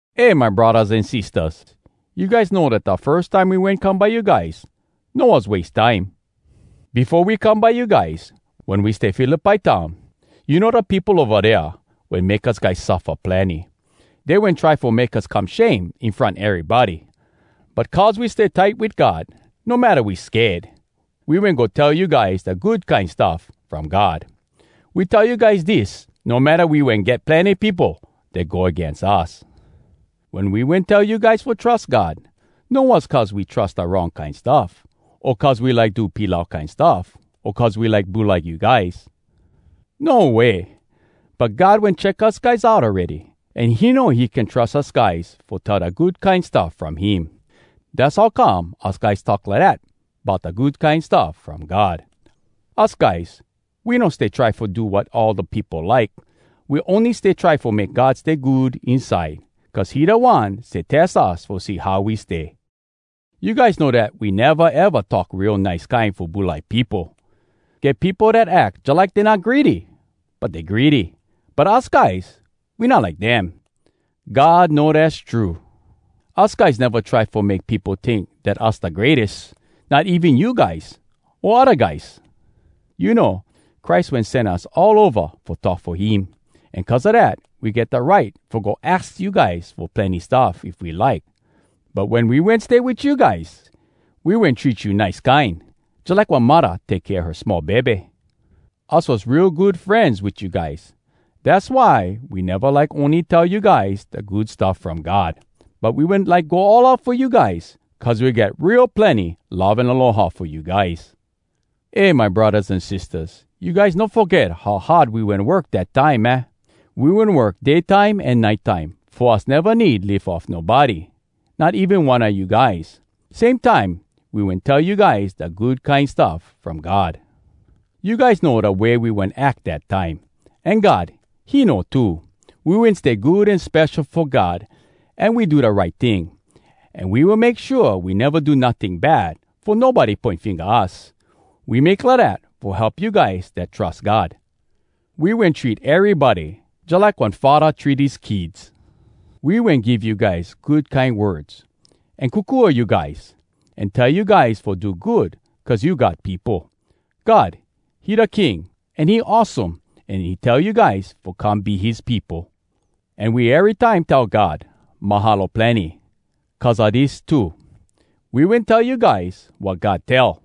Eh, my braddahs an sistahs, you guys know dat da firs time we wen come by you guys no was wase time. Befo we come by you guys, wen we stay Philippi town, you know da peopo ova dea wen make us guys suffa plenny. Dey wen try fo make us come shame in front erybody. But cuz we stay tight wit God, no matta we sked, we wen go tell you guys da Good Kine Stuff From God. We tell you guys dis, no matta we wen get plenny peopo dat go agains us. Wen we wen tell you guys fo trus God, no was cuz we trus da wrong kine stuff, o cuz we like do pilau kine stuff, o cuz we like bulai you guys. No way! But God wen check us guys out awready, an he know he can trus us guys fo tell da Good Kine Stuff from him. Dass how come us guys talk lidat bout da Good Kine Stuff From God. Us guys, we no stay try fo do wat all da peopo like. We ony stay try fo make God stay good inside! Cuz he da One stay tes us fo see how we stay. You guys know dat we neva eva talk real nice kine fo bulai peopo! Get peopo dat ack jalike dey not greedy, but dey greedy. But us guys, we not like dem. God know dass true! Us guys neva try fo make peopo tink dat us da greates—not even you guys o odda guys! You know, Christ wen sen us all ova fo talk fo him. An cuz a dat, we get da right fo go aks you guys fo plenny stuff, if we like. But wen we wen stay wit you guys, we wen treat you nice kine, jalike one muddah take kea her small bebe. Us was real good frenz wit you guys. Dass why we neva like ony tell you guys da Good Stuff From God, but we wen like go all out fo you guys, cuz we get real plenny love an aloha fo you guys. Eh, my braddahs an sistahs, you guys no foget how hard we wen work, dat time, aah? We wen work day time an nite time, fo us neva need live off nobody, not even one a you guys. Same time, we wen tell you guys da Good Kine Stuff From God. You guys know da way we wen ack dat time. An God, he know too. We wen stay good an spesho fo God, an we do da right ting, an we wen make shua we neva do notting bad fo nobody poin finga us. We make lidat fo help you guys dat trus God. We wen treat erybody jalike one faddah treat his kids. We wen give you guys good kine words, an kokua you guys, an tell you guys fo do good cuz you God peopo. God, he da King, an he awesome, an he tell you guys fo come be his peopo. An we erytime tell God “Mahalo plenny” cuz a dis too: We wen tell you guys wat God tell,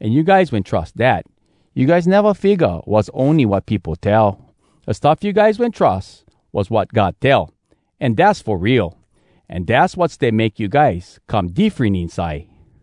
an you guys wen trus dat. You guys neva figga was ony wat peopo tell. Da stuff you guys wen trus was wat God tell, an dass fo real. An dass wat stay make you guys come diffren inside.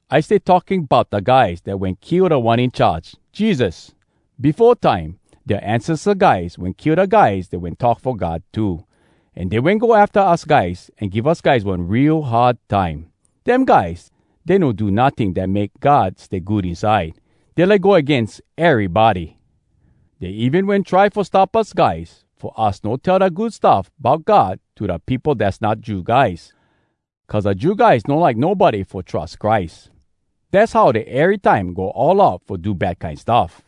I stay talking bout da guys dat wen kill Da One In Charge, Jesus. Befo time, dea ancesta guys wen kill da guys dat wen talk fo God too. An dey wen go afta us guys an give us guys one real hard time. Dem guys, dey no do notting dat make God stay good inside. Dey like go agains erybody! Dey even wen try fo stop us guys fo us no tell da Good Stuff bout God to da peopo dass not Jew guys. Cuz da Jew guys no like nobody fo trus Christ. Dass how dey erytime go all out fo do bad kine stuff.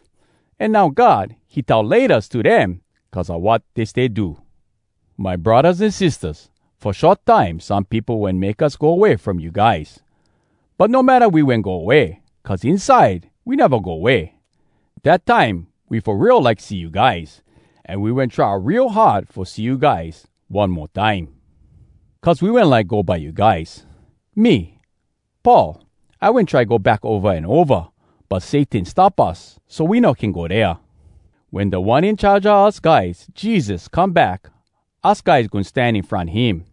An now God, he tell “Laytas” to dem cuz a wat dey stay do! My braddahs an sistahs, fo short time some peopo wen make us go way from you guys. But no matta we wen go way, cuz inside we neva go way. Dat time we fo real like see you guys, an we wen try real hard fo see you guys one mo time. Cuz we wen like go by you guys. Me, Paul, I wen try go back ova an ova, but Satan stop us so we no can go dea. Wen Da One In Charge a us guys, Jesus, come back, us guys goin stan in front him.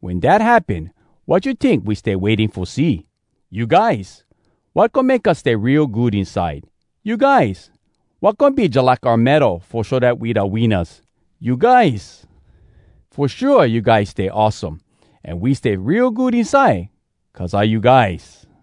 Wen dat happen, wat you tink we stay waiting fo see? You guys! Wat goin make us stay real good inside? You guys! Wat goin be jalike oua medal fo show dat we da winnas? You guys! Fo shua, you guys stay awesome, an we stay real good inside cuz a you guys!